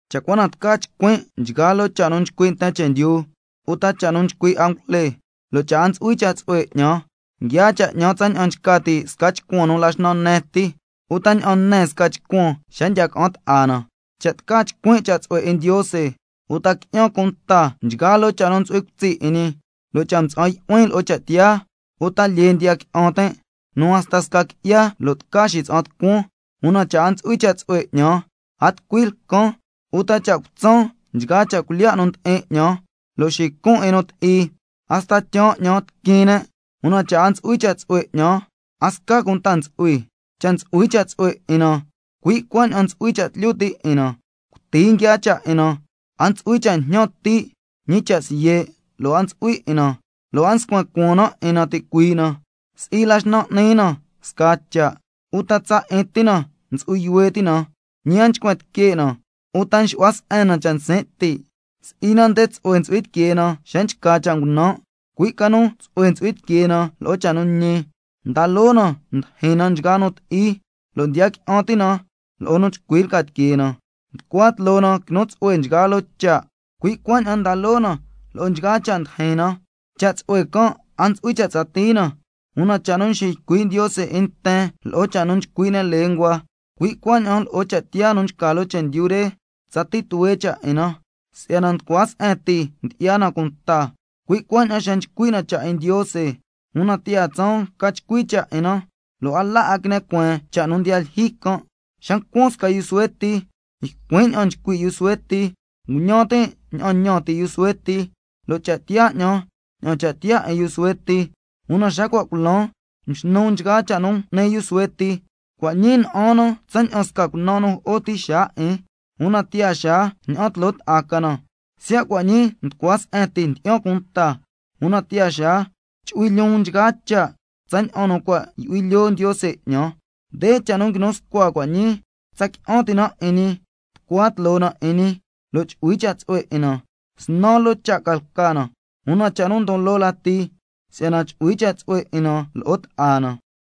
Cha' cua na tca chcuin' nchgaa loo cha' nu nchcui' nten chendyu uta cha' nu nchcui' angujle, lo' cha' a ntsu'hui cha' tsu'hue 'ñan, nguiaa cha' 'ñan tsaña'an nchca ti' sca chcuan nu la xnan ne ti uta ña'an ne sca chcuan xa ndiya ca'an ta'a na. Cha' tca chcuin' cha' tsu'hue 'in Ndiose, uta qui'yan cunta nchgaa loo cha' nu ntsu'hui cutsi' 'in ñi, lo' cha' mtsa'an yu'huin lo'o cha' tiyaa, uta lyee ndiya qui'an tin' nu hasta sca qui'ya lo' tca xitsa'an tucuan, una cha' a ntsu'hui cha' tsu'hue 'ñan, a tucui lcan. Uta cha' cutsan nchgaa cha' cuilyiya' nu ndi'in 'ñan lo' xicun 'in nu ti'i, hasta tyaan 'ñan nu tiquin ne', una cha' a ntsu'hui cha' tsu'hue 'ñan, a sca cunta ntsu'hui. Cha' ntsu'hui cha' tsu'hue 'in na ntsu'hui cha' tlyu ti' 'in na, cuti nguiaa cha' 'in na, a ntsu'hui cha' jñan ti', ñi cha' siye' lo' a ntsu'hui 'in na, lo' a nscuen cuaan na 'in na ticuii' na, si'i la xnan n'ni na scaa cha' uta tsa 'in ti na ntsu'hui yuhue ti' na, ñi a nchcuen tique' na uta nxu'hua se'en na cha' nsin' ti', si'i na nde tsu'hue ntsu'hui tiquee na xa nchca sca cha' ngunan', cui' ca nu tsu'hue ntsu'hui tiquee na lo'o cha' nu ñi. Nda loo na ndyijyin na nchgaa nu ti'i, lo' ndiya qui'an ti' na lo'o nu chcui lca tiquee na, nducua tloo na quinu tsu'hue nchgaa loo cha', cui' cuaña'an nda loo na lo'o nchgaa cha' ndijin na. Cha' tsu'hue can' a ntsu'hui cha' tsatii na, una cha' nu nxiycui' Ndiose 'in nten lo'o cha' nu nchcui' ne' lenguas, cui' cuaña'an lo'o cha' tiyaa nu nchca loo chendyu re tsatii tuhue cha' 'in na. Si'yana nducua se'en ti ndyi'ya na cunta, cui' cuaña'an xa nchcui' na cha' 'in Ndiose, una tiyaa tsaan ca chcui cha' 'in na, lo' a la 'a quine cueen cha' nu ndiya lyijyi can'. Xa ncuan sca yu suhue ti, ycuin' ña'an nchcui' yu suhue ti, nguñan tin' ña'an ñan ti' yu suhue ti, lo' cha' tiyaa 'ñan ña'an cha' tiyaa 'in yu suhue ti, una xa cua' culan mxnun nchgaa cha' nu n'ni yu suhue ti. Cua' ñii na'an na tsaña'an sca cunan nu jo'o ti xaa 'in, una tiyaa xaa ña'an tloo ta'a ca na. Siya' cua' ñii nducua se'en ti ndyi'yan cunta, una tiyaa xaa chu'hui lyoon nchgaa cha' tsaña'an nu cua' yu'hui lyoo Ndiose 'ñan. Nde cha' nu nguinu scua cua' ñii: Tsa qui'an ti' na 'in ñi, tucua tloo na 'in ñi, lo' chu'hui cha' tsu'hue 'in na. Snan loo cha' ca lca na, una cha' nu ndon loo lati, si'yana chu'hui cha' tsu'hue 'in na scasca na.